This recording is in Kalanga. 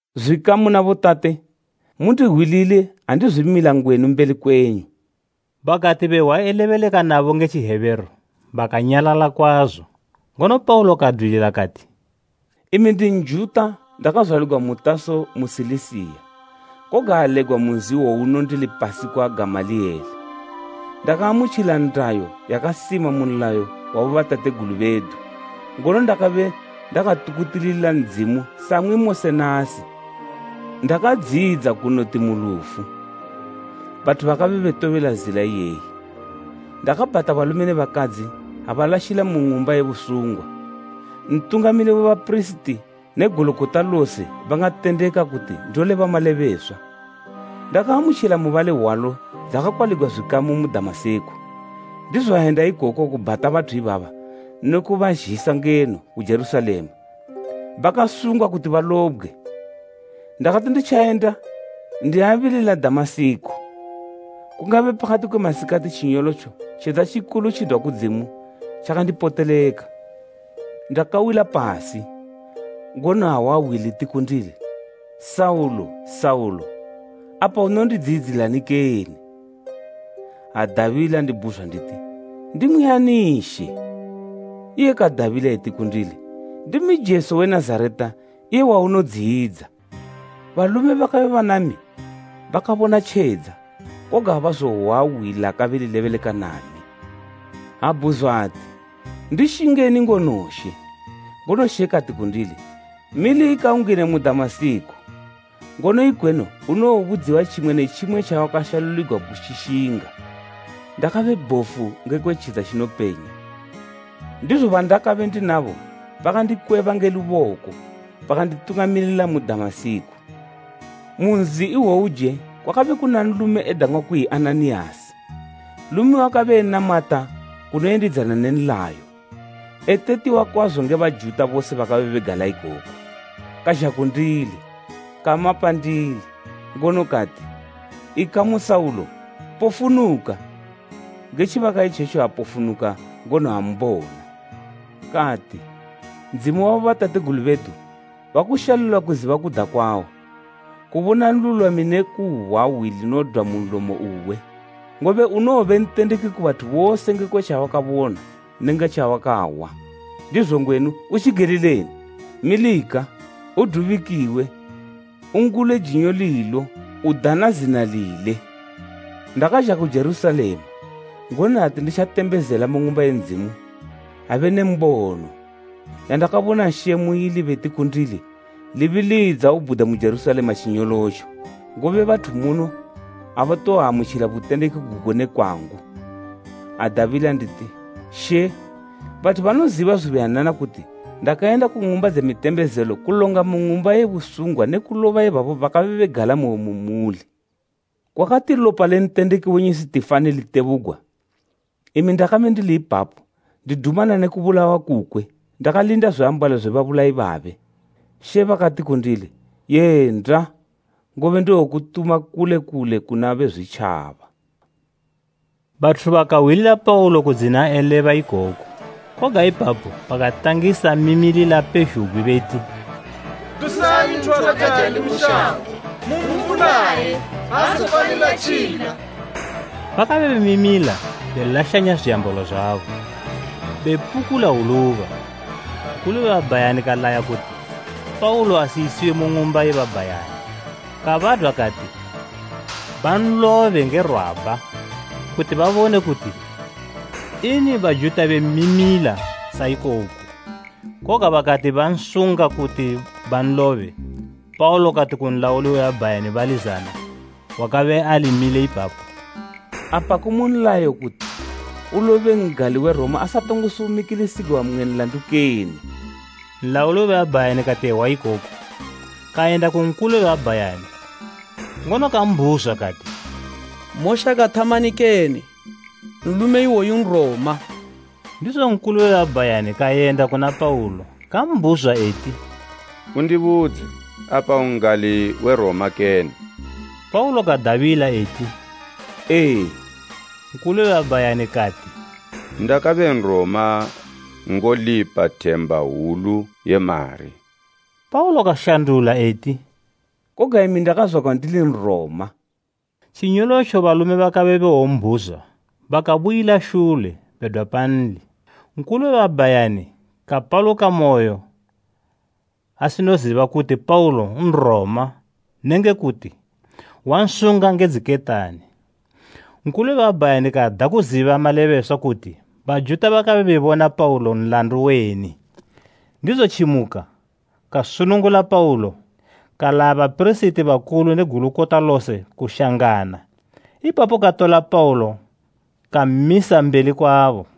“Zwikamu na botate, mundihwilile andizwimila ngwenu mbeli kwenyu!” Bakati behwa elebeleka nabo nge Tjihebheru bakanyalala kwazo; ngono Paulo kadwilila kati: “Imi ndi Njuta ndakazwaligwa mu Taso mu Silisiya, koga alegwa mu nzi iwowuno ndili pasi kwa Gamaliyele. Ndakaamutjila ndayo yakasima mu nlayo wa bobatategulu bedu ngono ndakabe ndakatukutilila Ndzimu samwi mose nasi. Ndakadziyidza kunoti mu lufu, bathu bakabe betobela zila iyeyi. Ndakabhata balume ne bakadzi ha balashila mu ng'umba ye busungwa. Ntungamili we bapirisiti ne Gulukota lose bangatendeka kuti ndoleba malebeswa. Ndakaamutjila mubali hwalo dzakwaligwa zwikamu mu Damasiko, ndizo ayenda ikoko kubhata bathu ibaba ne kubazhisa ngeno ku Jerusalema bakasungwa kuti balobgwe. “Ndakati nditjayenda ndiabilila Damasiko, kungabe pakati kwe masikati tjinyolotjo tjedza tjikulu tjidwa kudzimu tjakandipoteleka. Ndakawila pasi, ngono ahwa hwi liti kundili, ‘Saulo, Saulo! Apa unondidziyidzilani kene?’ Adabila ndibhuzwa nditi, ‘Ndimwi ani She?’ Iye kadabila eti kundili, ‘Ndimi Jesu we Nazareta, iye waunodziyidza.’ Balume bakabe banami bakabona tjedza, koga abazohwa hwi lakabe lilebeleka nami. Abhuzwa ati, ‘Ndishingeni ngono She?’ Ngono She kati kundili, ‘Milika ungine mu Damasiko, ngono ikweno unowobudziwa tjimwe ne tjimwe tjawakashaluligwa kutjishinga!’ Ndakabe bhofu ngekwe tjedza tjinopenya, ndizo bandakabe ndinabo bakandikweba nge luboko bakanditungamilila mu Damasiko. “Mu nzi iwowuje kwakabe kuna nlume edang'wa kuyi Ananiyasi, nlume wakabe enamata kunoyendidzana ne nlayo, etetiwa kwazo nge Bajuta bose bakabe begala ikoko. Kazha kundili, kama pandili, ngono kati, ‘Ikamu Saulo, pofunuka!’ Nge tjibaka itjetjo apofunuka, ngono ambona. Kati, ‘Ndzimu wa bobatategulu bedu wakushalulila kuziba kuda kwawo, kubona Nlulwami ne kuhwa hwi linodwa mu nlomo uwe. Ngobe unowobe ntendeki ku bathu bose ngekwe tjawakabona nenge tjawakahwa. Ndizo ngwenu, utjigelileni? Milika, udubikiwe ungule jinyo lilo udana zina lile.’ “Ndakazha ku Jerusalema, ngono ati nditjatembezela mu Ng'umba ye Ndzimu, abe ne mbono, yandakabona She muili beti kundili, ‘Libilidza ubhude mu Jerusalema tjinyolotjo, ngobe bathu muno abatowoamutjila butendeki gugo nge kwangu.’ Adabila nditi, ‘She, bathu banoziba zubuyanana kuti ndakayenda ku ng'umba dze mitembezelo kulonga mu ng'umba ye busungwa ne kuloba ibabo bakabe begalamoyo mu muli. Kwakati lopa le ntendeki wenyu Sitifani litebugwa, imi ndakabe ndili ipapo ndidumana ne kubulawa kukwe ndakalinda zwiambalo zwe babulayi babe.’ She bakati kundili, ‘Yenda, ngobe ndowokutuma kule kule kuna Bezwitjaba.’” Bathu bakahwilila Paulo kudzina eleba ikoku, koga ipapo bakatangisa mimilila pezhugwi beti, “Dusani nthu wakajali mu shango! Mumbulaye! Aazofanilo tjila!” Bakabe bemimila belashanya zwiambalo zwabo, bepukula hwuluba. Nkulu we babhayani kalaya kuti Paulo ayisiwe mu ng'umba ye babhayani, kabadwa kati banlobe nge rwabha kuti babone kuti ini Bajuta bemmimila sa ikoku. Koga bakati bansunga kuti banlobe Paulo kati ku nlauli we babhayani bali zana wakabe ali mile ipapo, “Apa ku mu nlayo kuti ulobe n'gali we Roma asatongo sumikilisigwa mmwe nlandu kene?” Nlauli we babhayani kati ehwa ikoku, kayenda ku Nkulu we babhayani, ngono kambhuzwa kati, “Moshaka thamani kene? Nlume iwoyu Nroma!” Ndizo Nkulu we babhayani kayenda kuna Paulo kambhuzwa eti, “Undibudze, apa un'gali we Roma kene?” Paulo kadabila eti, “Ee.” Nkulu we babhayani kati, “Ndakabe Nroma ngolipa themba hwulu ye mari.” Paulo kashandula eti, “Koga imi ndakazwagwa ndili Nroma.” Tjinyolotjo balume bakabe bewombhuzwa bakabuyila shule bedwa panli; Nkulu we babhayani kapalukamoyo asinoziba kuti Paulo Nroma nenge kuti wansunga nge dziketani. Nkulu we babhayani kada kuziba malebeswa kuti Bajuta bakabe bebona Paulo nlandu weni; ndizo tjimuka kasunungula Paulo kalaya bapirisiti bakulu ne Gulukota lose kushangana. Ipapo katola Paulo kammisa mbeli kwabo.